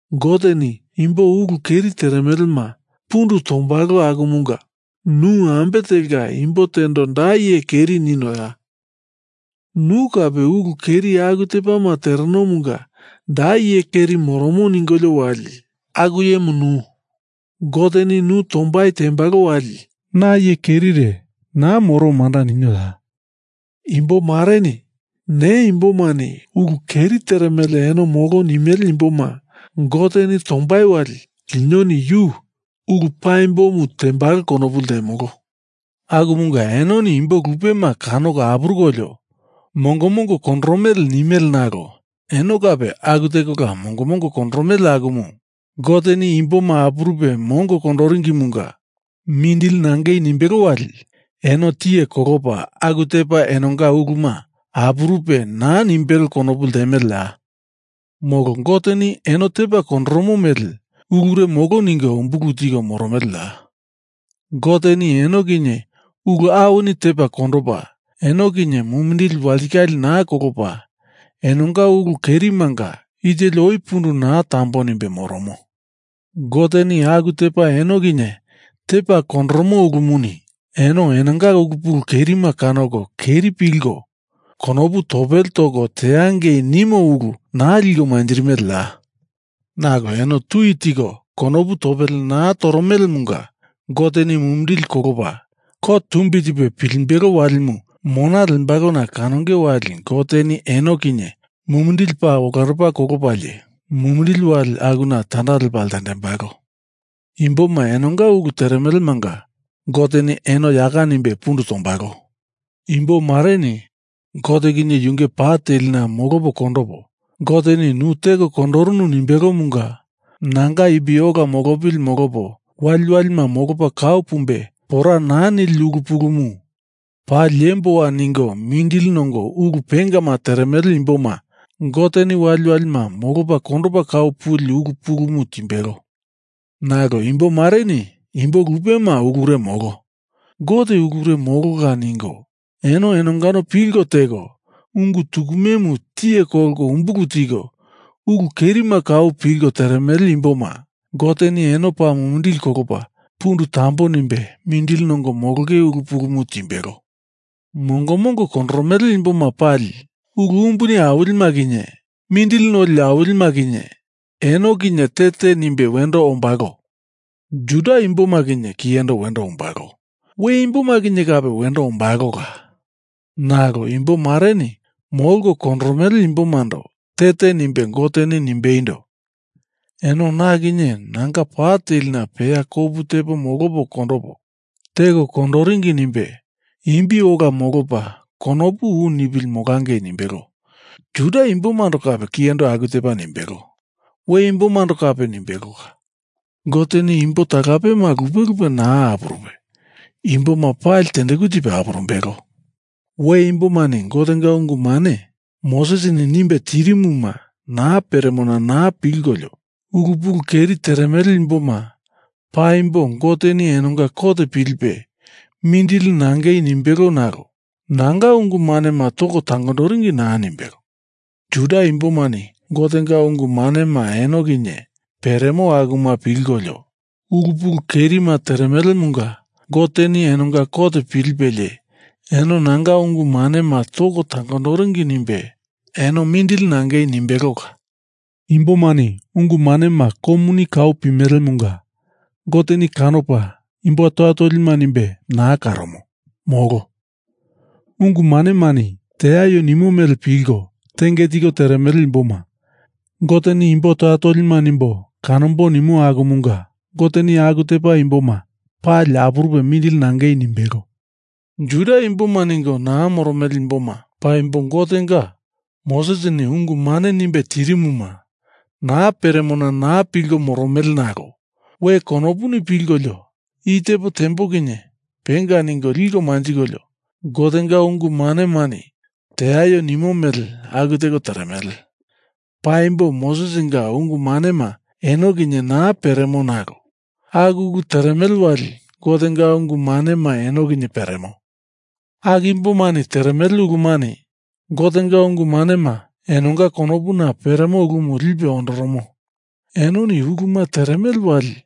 Goteni imbo ulu keri teremelema pundu tombalo akumunga nu ambe telka imbo tendo da iye keri ninoya? Nu kape ulu keri aku tepama terenomunga da iye keri moromo ningolio wali aku iyemu nu. Goteni nu tombai tembalo wali na iye kerire naa moro manda ninioya? Imbo mareni ne imbomani ulu keri teremele, eno molo nimele imboma Goteni tombai wali linoni yu ulu paimbomu tembalo konopu ltemolo. Akumunga enoni imbo lupema kanoko apurukolio mongo mongo kondoromele nimele nalo eno kape aku tekola mongo kondoromele akumu Goteni imboma apurupe mongo kondoringimunga mindili nangei nimbelo wali eno tiye kolopa aku tepa enonga uluma apurupe naa nimbelo konopu ltemeleya? Molo Goteni eno tepa kondoromo mele ulure molo ningo umbulu tiko moromeleya? Goteni eno kinye ulu awini tepa kondopa, eno kinye mumindili walitikale naa kolopa, enonga ulu kerimanga i teli oi pundu naa tambo nimbe moromo. Goteni aku tepa eno kinye tepa kondoromo ulumuni eno enonga ulu pulu kerima kanoko keri pilko konopu topele toko teangei nimo ulu naa liko manjirimeleya? Nalo eno tui tiko konopu topele naa toromelemunga Goteni mumindili kolopa kot tumbi tipe pilimbelo walimu mona lembalona kanonge wali Goteni eno kinye mumindili paa olandopa kolopalie mumindili wali akuna tanda lepa ltendembalo. Imbomanga enonga ulu teremelemanga Goteni eno yaka nimbe pundu tombalo. Imbo mareni Gote kinye yunge pa telina molopo kondopo, Goteni nu teko kondorunu nimbelomunga nanga imbi ola molopili molopo, waliwalima molopa kau pumbe pora naa nili ulu pulumu paa liemboa ningo mindili nongo ulu pengama teremele imboma Goteni waliwalima molopa kondopa kau puli ulu pulumu timbelo. Nalo imbo mareni imbo lupema ulure molo. Gote ulure molola ningo eno enongano pilko teko ungu tukumemu tiye kolko umbulu tiko, ulu kerima kau pilko teremele imboma Goteni eno paa mumindili kolopa pundu tambo nimbe mindili nongo molonge ulu pulumu timbelo. Mongo mongo kondoromele imboma pali ulu umbuni awilima kinye mindili noli awilima kinye eno kinye te te nimbe wendo ombalo. Juda imboma kinye kiyendo wendo ombalo, we imboma kinye kape wendo ombalola. Nalo imbo mareni molko kondoromele imbomando te te nimbe Goteni nimbeindo: Eno na kinye nanga pa telina peya kopu tepo molopo kondopo, teko kondoringi nimbe imbi ola molopa konopu u nipili molangei nimbelo. Juda imbomando kape kiyendo aku tepa nimbelo, we imbomando kape nimbelola. Goteni imbo talapema lupe lupe naa apurupe, imboma pali tendeku tipe apurumbelo. We imbomani Gotenga ungu mane Mosesini nimbe tirimuma naa peremona naa pilkolio ulu pulu kerima teremele imboma paimbo Goteni enonga kot pilipe mindili nangei nimbelo nalo nanga ungu manema toko tangondoringi naa nimbelo. Juda imbomani Gotenga ungu manema eno kinye peremo akuma pilkolio, ulu pulu kerima teremelemunga Goteni enonga kot pilipelie eno nanga ungu manema toko tangondoringi nimbe eno mindili nangei nimbelola. Imbomani ungu manema komuni kau pimelemunga Goteni kanopa imbo toya tolima nimbe naa karomo, molo. Ungu manemani teaio nimo mele pilko tenge tiko teremele imboma Goteni imbo toya tolima nimbo kanombo nimo akumunga Goteni aku tepa imboma pali apurupe mindili nangei nimbelo. Juda imboma ningo naa moromele imboma paimbo Gotenga Mosesini ungu mane nimbe tirimuma naa peremona naa pilko moromele nalo we konopuni pilkolio i tepo tembo kinye penga ningo liko manjikolio Gotenga ungu manemani teaio nimo mele aku teko teremele. Paimbo Mosesinga ungu manema eno kinye naa peremo nalo aku ulu teremele wali Gotenga ungu manema eno kinye peremo. Aku imbomani teremele ulumani Gotenga ungu manema enonga konopuna peremo ulumu lipe ondoromo. Enoni uluma teremele wali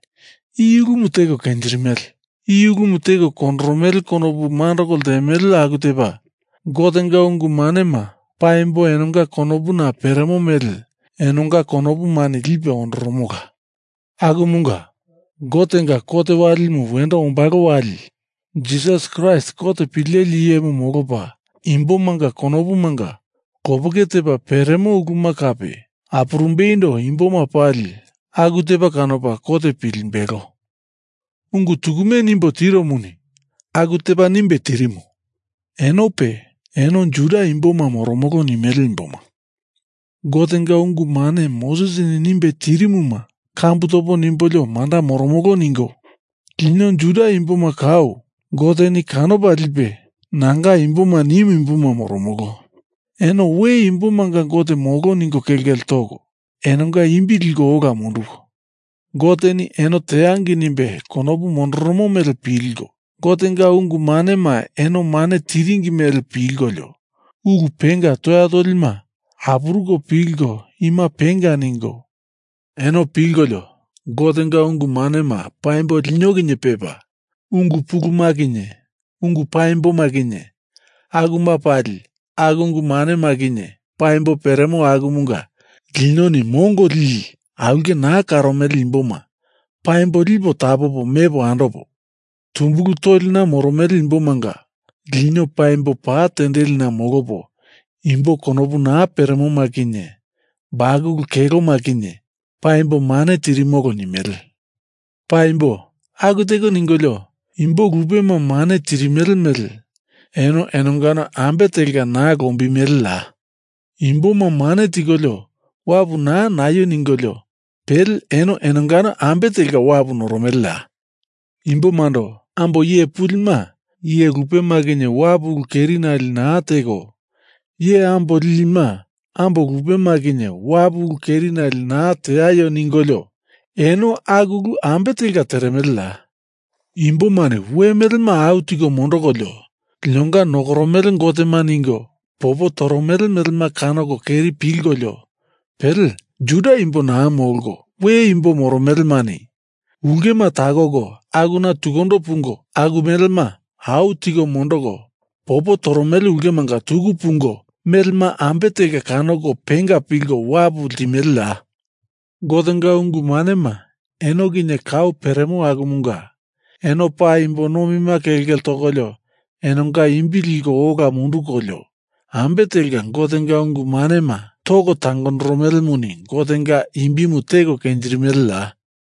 i ulumu teko kenjirimele, i ulumu teko kondoromele konopu mandoko ltemele aku tepa Gotenga ungu manema paimbo enonga konopuna peremo mele enonga konopumani lipe ondoromola. Akumunga Gotenga kot walimu wendo ombalo wali Jisas Kraist kot pileli iyemu molopa imbomanga konopumanga lopeke tepa peremo uluma kape apurumbeindo imboma pali aku tepa kanopa kot pilimbelo. Ungu tukume nimbo tiromuni aku tepa nimbe tirimo. Enope, eno Juda imboma moromolo nimele imboma, Gotenga ungu mane Mosesini nimbe tirimuma kambu topo nimbolio manda moromolo ningo, lino Juda imboma kau Goteni kanopa lipe nanga imboma nimu imboma moromolo, eno we imbomanga Gote molo ningo kelkele toko enonga imbi liko ola munduko, Goteni eno teangei nimbe konopu mondoromo mele pilko, Gotenga ungu manema eno mane tiringi mele pilkolio ulu penga toya tolima apuruko pilko ima penga ningo, eno pilkolio Gotenga ungu manema paimbo lino kinye pepa ungu puluma kinye ungu paimboma kinye akuma pali aku ungu manema kinye paimbo peremo akumunga linoni mongo lili aulke naa karomele imboma paimbo lipo tapopo mepo andopo, tumbulu tolina moromele imbomanga lino paimbo pa tendelina molopo, imbo konopu naa peremoma kinye bakulu keloma kinye paimbo mane tirimolo nimele. Paimbo aku teko ningolio imbo lupema mane tirimele mele eno enongano ambe telka naa lombimeleya? Imboma mane tikolio wapu naa naio ningolio pele eno enongano ambe telka wapu noromeleya? Imbomando ambo iye pulima iye lupema kinye wapu ulu kerinale naa teko, iye ambo lilima ambo lupema kinye wapu ulu kerinale naa teaio ningolio eno aku ulu ambe telka teremeleya? Imbomani we melema au tiko mondokolio linonga nokoromele gotema ningo popo toromele melema kanoko keri pilkolio pele Juda imbo naa molko we imbo moromelemani ulkema takoko akuna tukundo pungo aku melema au tiko mondoko popo toromele ulkemanga tuku pungo melema ambe telka kanoko penga pilko wapu ltimeleya? Gotenga ungu manema eno kinye kau peremo akumunga eno paa imbo nomima kelkele tokolio enonga imbi liko ola mundukolio ambe telka Gotenga ungu manema toko tangondoromelemuni Gotenga imbimu teko kenjirimeleya?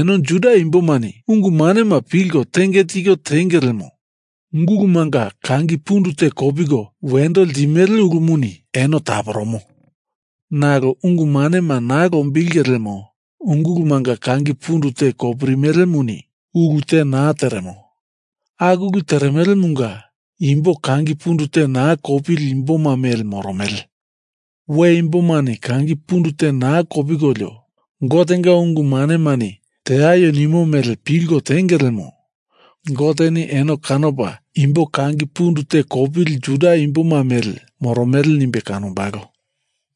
Eno Juda imbomani ungu manema pilko tenge tiko tenge lemo ungulumanga kangi pundu te kopiko wendo ltimele ulumuni eno taporomo, nalo ungu manema naa lombilinge lemo ungulumanga kangi pundu te kopirimelemuni ulu te naa teremo. Aku ulu teremelemunga imbo kangi pundu te naa kopili imboma mele moromele. We imbomani kangi pundu te naa kopikolio Gotenga ungu manemani teaio nimo mele pilko tenge lemo Goteni eno kanopa imbo kangi pundu te kopili Juda imboma mele moromele nimbe kanombalo.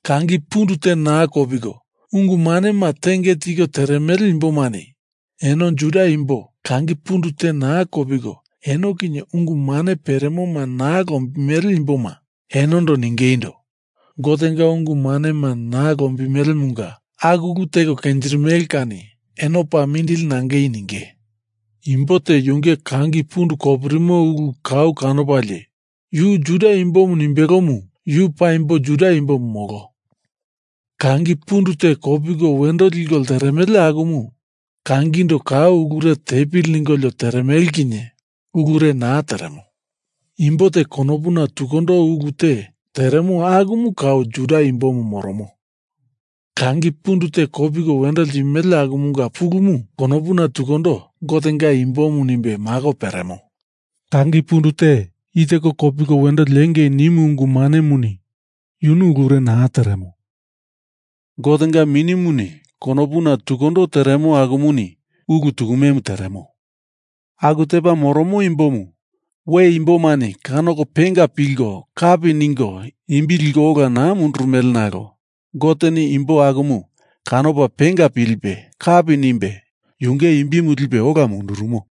Kangi pundu te naa kopiko ungu manema tenge tiko teremele imbomani eno Juda imbo kangi pundu te kopiko eno kinye ungu mane peremoma naa lombimele imboma enondo ningeindo, Gotenga ungu manema naa lombimelemunga aku ulu teko kenjirimele kani eno paa mindili nangei ninge. Imbo te yunge kangi pundu kopirimo ulu kau kanopalie yu Juda imbomu nimbelomu yu paimbo Juda imbomu molo. Kangi pundu te kopiko wendo liko lteremele akumu kangindo kau ulure tepili ningolio teremele kinye ulure naa teremo. Imbo te konopuna tukundo ulu te teremo akumu kau Juda imbo tukumemu moromo. Kangi pundu te kopiko wendo ltimele akumunga pulumu konopuna tukundo Gotenga imbomu nimbe mako peremo. Kangi pundu te i teko kopiko wendo liengei nimu ungu manemuni yunu ulure naa teremo. Gotenga Minimuni konopuna tukundo teremo akumuni ulu tukumemu teremo. Aku tepa moromo imbomu, we imbomani kanoko penga pilko kapi ningo imbi liko ola naa mundurumele nalo Goteni imbo akumu kanopa penga pilipe kapi nimbe yunge imbimu lipe ola mundurumo.